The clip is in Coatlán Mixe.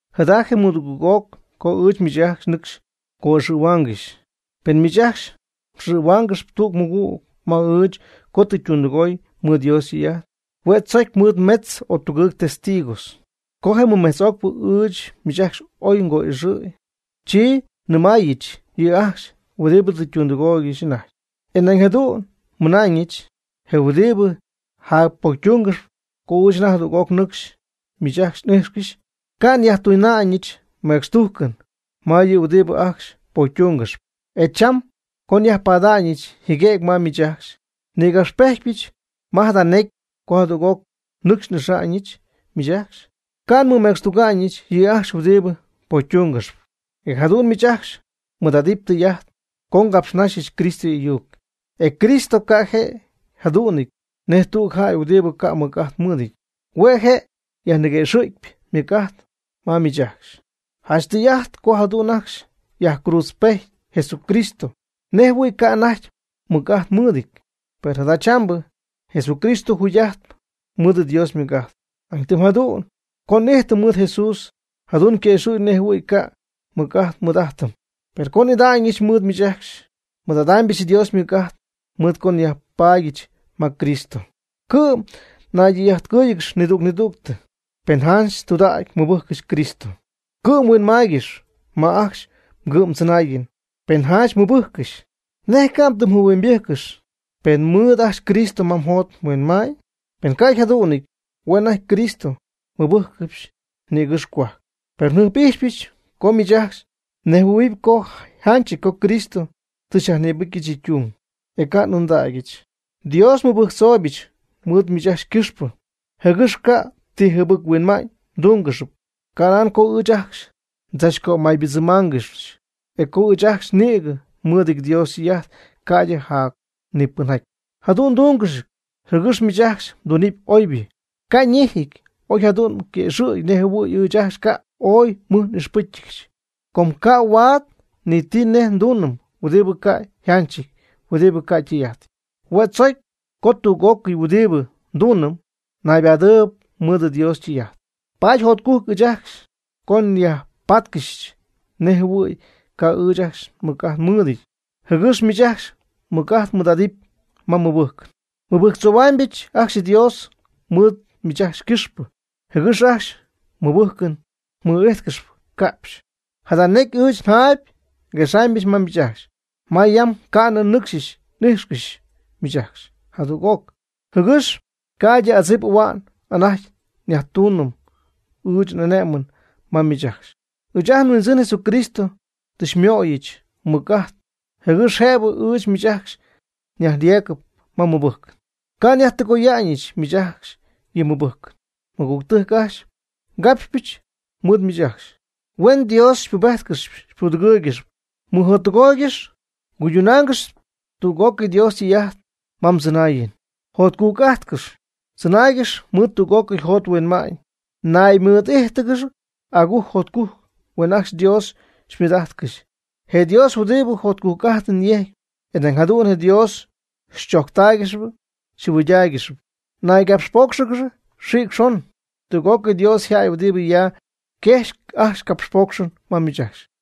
Jada je' ymɨdugɨɨg'oc co ɨɨch miich ajcxy nɨcxy ngo'ixɨ̈huaangɨxyp. Pen miich ajcxy mxɨ̈huaangɨxyp tüg mɨgüg ma ɨɨch co tɨ ytundɨgooy mɨɨd Dios ytɨy'ajt, hue' tzocy mɨɨd metz o tugɨɨg testigos. Co je mɨmejtz'ocpɨ ɨɨch miich ajcxy oy ngo'ixɨ̈y, chi nnɨmaayɨch yɨ' ajcxy huɨdibɨ tɨ ytundɨgooygɨxy anajty, e nañ jadu'n nnɨmaayɨch je huɨdibɨ jacpocytungɨxp co ɨɨch anajty jadüg'oc nɨcxy miich ajcxy n'ijxcɨxy, ca' nyajtuna'ñɨch mecxtujcɨn ma yɨ huɨdibɨ ajcxy pocytungɨxp. E cham co nyajpaadyɨch jɨguëgy ma miich ajcxy, nnïgapxpejtpyɨch ma jada necy co jadüg'oc nɨcxy n'ixa'ñɨch miich ajcxy, ca' nmɨmecxtuga'ñɨch yɨ' ajcxy huɨdibɨ pocytungɨxp. E jadu'n miich ajcxy mmɨɨd'adɨpy tɨy'ajt co ngapxnajxɨch Cristo y'ayuc. E Cristo ca' je' yjadu'nɨty nej tüg jäy huɨdibɨ ca' mɨc'ajt mɨɨdɨty. Hue' je' yajniguëxɨ̈gyp ymɨc'ajt ma miich ajcxy. Janch tɨy'ajt co jadu'n ajcxy yajcruudzpejty Jesucristo nej jɨhuɨ̈y ca' anajty mɨc'ajt mɨɨdɨty. Per jadachambɨ Jesucristo jugy'ajtp mɨɨd Dios ymɨc'ajt. Nañ tɨm jadu'n co n'ijtɨm mɨɨd Jesús, jadu'n yquëxɨ̈gy nej jɨhuɨ̈y ca' mɨc'ajt nmɨɨd'ajtɨm. Per co n'ida'ñɨch mɨɨd miich ajcxy, nmɨɨd'adaanɨbɨch Dios ymɨc'ajt mɨɨd co nyajpaadyɨch ma Cristo. Cɨ'm naydɨy'ajtpɨ́jcɨgɨx nidüg nidüg, pen janch tɨydudägy mmɨbɨjccɨxy Cristo. Cɨ'm huinmaaygɨx ma ajcxy mgɨ'mdzɨnaayɨn, pen janch mmɨbɨjccɨxy. ¿Nej ca' mdɨmjɨhuɨ'mybɨjccɨxy, pen mɨɨd ajcxy Cristo ma mjot mhuinma'ñ? Pen ca' yjadu'nɨty hue' anajty Cristo mmɨbɨjccɨxy nïgɨ́xy cohuajc. Per njɨjp'ijxypɨch co miich ajcxy mnejhuɨ̈huɨpy co yjanchɨty co Cristo tɨ xyajnïbɨcyɨch yɨ' ytung, e ca' n'ɨɨndägyɨch. Dios nmɨbɨjctzooybɨch mɨɨd miich ajcxy ycɨxpɨ, jɨgɨx ca' ti jɨbɨc-huinma'ñ mdúngɨxɨpy. Canan co ɨɨch ajcxy ndzachcömaybɨdzɨmmáangɨxyɨch, o co ɨɨch ajcxy nïgɨ nmɨɨdɨty Dios ytɨy'ajt ca'ydɨ jac ni pɨnjaty. Jadu'n ndúngɨxyɨch, jɨgɨx miich ajcxy mdunɨpy oybɨ. Ca' ñejɨty oy jadu'n yquëxɨ̈gɨpy nej jɨhuɨ̈y ɨɨch ajcxy ca' oy mɨj n'ixpɨ́cycɨgɨch. Com ca' huaad ni ti nej ndunɨm huɨdibɨ ca' yjanchɨty huɨdibɨ ca' ytɨy'ajtɨty. Hue' tzocy co tüg'ócɨy huɨdibɨ ndunɨm, naybadɨɨb mɨɨd Dios ytɨy'ajt. Paady jotcujc ɨɨch ajcxy co nyajpáatcɨxyɨch nej jɨhuɨ̈y ca' ɨɨch ajcxy mɨc'ajt nmɨɨdɨty, jɨgɨx miich ajcxy mɨc'ajt mmɨɨd'adɨpy ma mmɨbɨjcɨn. Nmɨbɨjctzoohuaamybɨch ajcxy Dios mɨɨd miich ajcxy ycɨxpɨ, jɨgɨx ajcxy mmɨbɨjcɨn mɨ'íjtcɨxɨpy ca'pxy. Jada necy ɨɨch jayɨjp nguexamyb ma miich ajcxy, ma yam ca'nɨ nɨcxy n'íjxcɨxyɨch miich ajcxy jadüg'oc, jɨgɨx ca'ydɨ adzip ahua'n anajty nyajtuuñ ɨɨch n'ane'mɨn ma miich ajcxy. Ɨɨch ajt nHuindzɨn Jesucristo tɨ xymöyɨch mɨc'ajt, jɨgɨx jëbɨ ɨɨch miich ajcxy nyajyeegɨpy ma mmɨbɨjcɨn. Ca' nyajtɨgoyaanɨch miich ajcxy yɨ mmɨbɨjcɨn. Mɨgügtɨjc ajcxy, capxcɨjxpɨch mɨɨd miich ajcxy, huen Dios xypubéjtcɨxɨpy xypudɨgɨ́ɨygɨxyɨpy. Mɨjottɨgooygɨx cuydunaangɨx tüg'ócɨy Dios ytɨy'ajt ma mdzɨnaayɨn. Jotcujc'ajtcɨx. Chɨnaaygɨx mɨɨd tú'cɨy mjot mhuinma'ñ. Naymɨɨd'íjtɨgɨxy agujc jotcujc. Huen ajcxy Dios xymɨɨd'ijtcɨxy. Je Dios huɨdibɨ jotcujc'ajtɨn yejcp, e nañ jadu'n Dios xychojctáaygɨxɨpy xyjɨhuɨydáaygɨxɨpy. Naygapxpóocxɨgɨx xïc xon. Tüg'ócɨy Dios yjäy huɨdibɨ ya, yquejxyp ajcxy capxpóocxɨn ma miich ajcxy.